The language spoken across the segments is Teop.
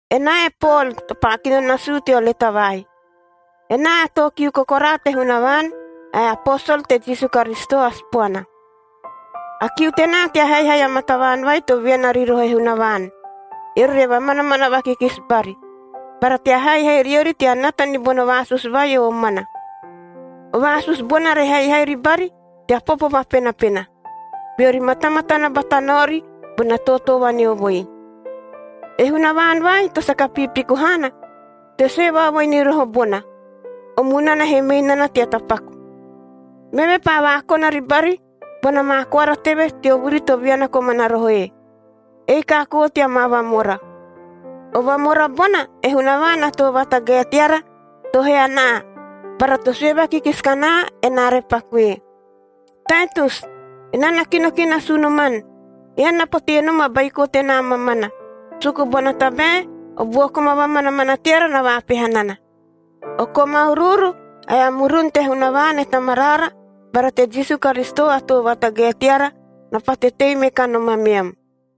Enaa e Pol to paa kino nasuu teo leta vai. Enaa a too kiu kokoraa te Hunavaan ae a aposol te Jisu Karisito a Sipoana. A kiu tenaa tea haihai amaa tavaan vai to viana ri roho e Hunavaan, eori re vamanamana vakikisi bari, bara tea haihai riori tea nata ni bono vaasusu vai o omana. O vaasusu bona re haihai ribari tea popo vapenapena, beori matamatana bata naori bona tootoo vaneovoi. E Hunavaan vai to saka piipiku haana to sue vaovoi ni roho bona, o munana he mei nana tea tapaku. Meve paa vaakona ribari bona maa koara teve teo vuri to viana komana rohoe, ei kaakoo tea maa vamora. O vamora bona e Hunavaan a Too Vatagae teara to hee anaa bara to sue vakikisi kanaa, enaa re paku ee. Taitus, enaa na kino ki nasu unoman. Ean na potee nom a baiko tenaa mamana, suku bona tabae o buo koma vamanamana teara na vaapeha nana. O koma uruuru ae a murun te Hunavaan e Tamaraara bara te Jisu Karisito a Too Vatagae teara na pate tei me kanom ameam.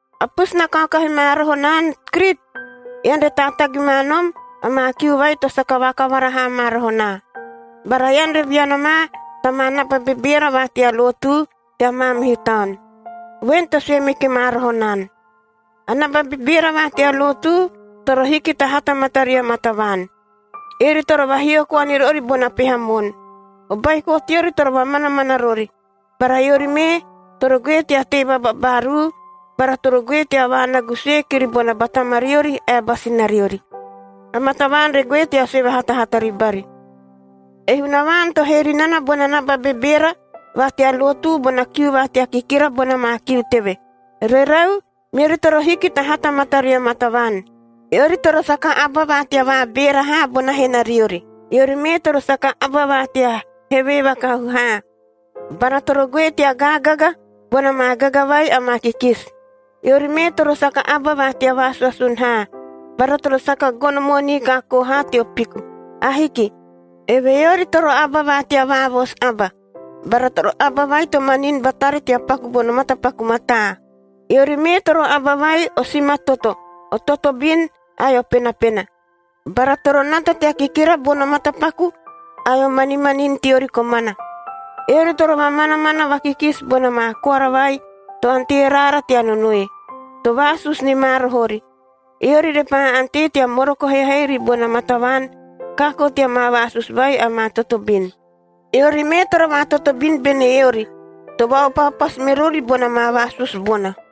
A pusu na kaokahi ma roho naan Krit, ean re taatagi ma nom amaa kiu vai to saka vakavara haa ma roho naa. Bara ean re viana ma ta maa naba bebeera va tea lotu tea maamihu taon, voen to sue meki ma roho naan. A naba bebeera va tea lotu toro hiki ta hata mataria maa tavaan. Eori toro vahio koa ni rori bona peha moon. O baiko teori toro vamanamana rori, bara eori mee toro goe tea tei vababaaruu bara toro goe tea vaanagu sue kiri bona ba tamariori ae a ba sinariori, amaa tavaan re goe tea sue vahatahata ribari. E Hunavaan to hee ri nana bona naba bebeera va tea lotu bona kiu va tea kikira bona maa kiu teve. Rerau, meori toro hiki ta hata mataria maa tavaan. Eori toro saka aba va tea vaabeera haa bona henariori. Eori mee toro saka aba va tea hevee vakahu haa bara toro goe tea gaagaga bona maa gaga vai amaa kikisi. Eori mee toro saka aba va tea vaasuasun haa, bara toro saka gono moonii kaakoo haa teo piku. Ahiki! Evehee eori toro aba va tea vaavoosu aba bara toro aba vai to manini batari tea paku bono matapaku mataa. Eori mee toro aba vai o simatoto, o totobin ae o penapena. Bara toro nata tea kikira bono matapaku ae o manimanini teori komana. Eori toro vamanamana vakikisi bona maa koara vai to ante raara tea nonoe, to vaasusu ni ma roho ori. Eori repaa ante tea moroko haihai ribona maa tavaan kaakoo tea maa vaasusu vai amaa totobin. Eori mee toro vaatotobin bene eori to vaaopaopasu me rori bona maa vaasusu bona.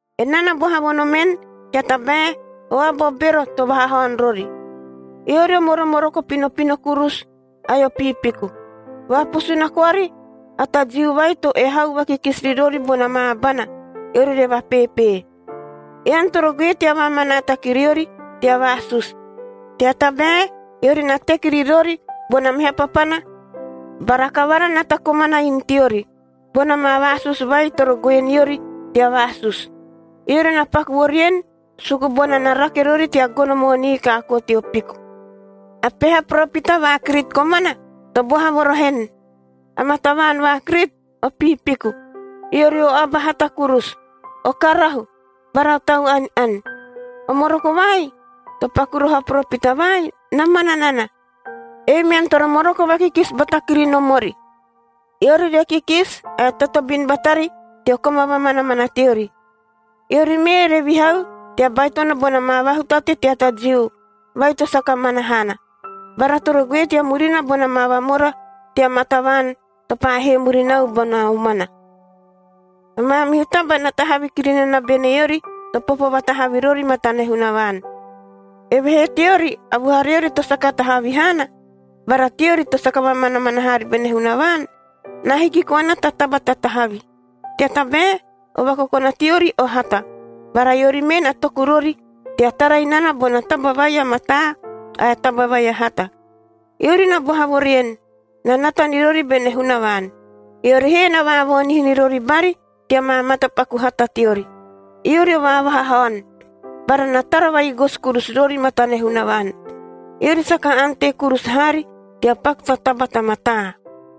Enaa na boha vo nomen, tea tabae o aba o bero to vahahaon rori. Eori o moromoroko pinopino kurusu ae o piipiku, vaapusuna koari a ta Jiu vai to ehau vakikisi ri rori bona maa abana, eori re vapeepee. Ean toro goe tea vaamanaata ki riori tea vaasusu, tea tabae eori na teki ri rori bona meha papana bara kavara na ta komana inu teori, bona maa vaasusu vai toro goe niori tea vaasusu. Eori na paku vo rien, suku bona na rake rori tea gono moonii kaakoo teo piku. A peha poropita va Krit komana, to boha vo roho en, “Amaa tavaan va Krit o piipiku, eori o aba hata kurusu, o karahu bara o tau ani-ani.” O moroko vai to paku roho a poropita vai, na mana nana. Ei mean toro moroko vakikisi bata kiri nomori, eori re kikisi ae totobin batari teo koma vamanamana teori. Eori mee re vihau tea baitono bona maa vahutate tea ta Jiu vai to saka mana haana, bara toro goe tea murina bona maa vamora tea maa tavaan to paa hee murinau bona omana. A maamihu taba na tahavi kiri nana bene eori to popo vatahavi rori matane Hunavaan. Evehee teori a vuhariori to saka tahavi haana bara teori to saka vamanamana haari bene Hunavaan, na hiki koana ta taba ta tahavi. Tea tabae o vakokona teori o hata, bara eori mee na toku rori tea tara inana bona taba vai a mataa ae taba vai a hata. Eori na boha vo rien, na nata ni rori bene Hunavaan, eori he na vaavoonihi ni rori bari tea maa matapaku hata teori. Eori o vaavahahaon bara na tara va-igosi kurusu rori matane Hunavaan. Eori saka ante kurusu haari tea paku ta taba ta mataa.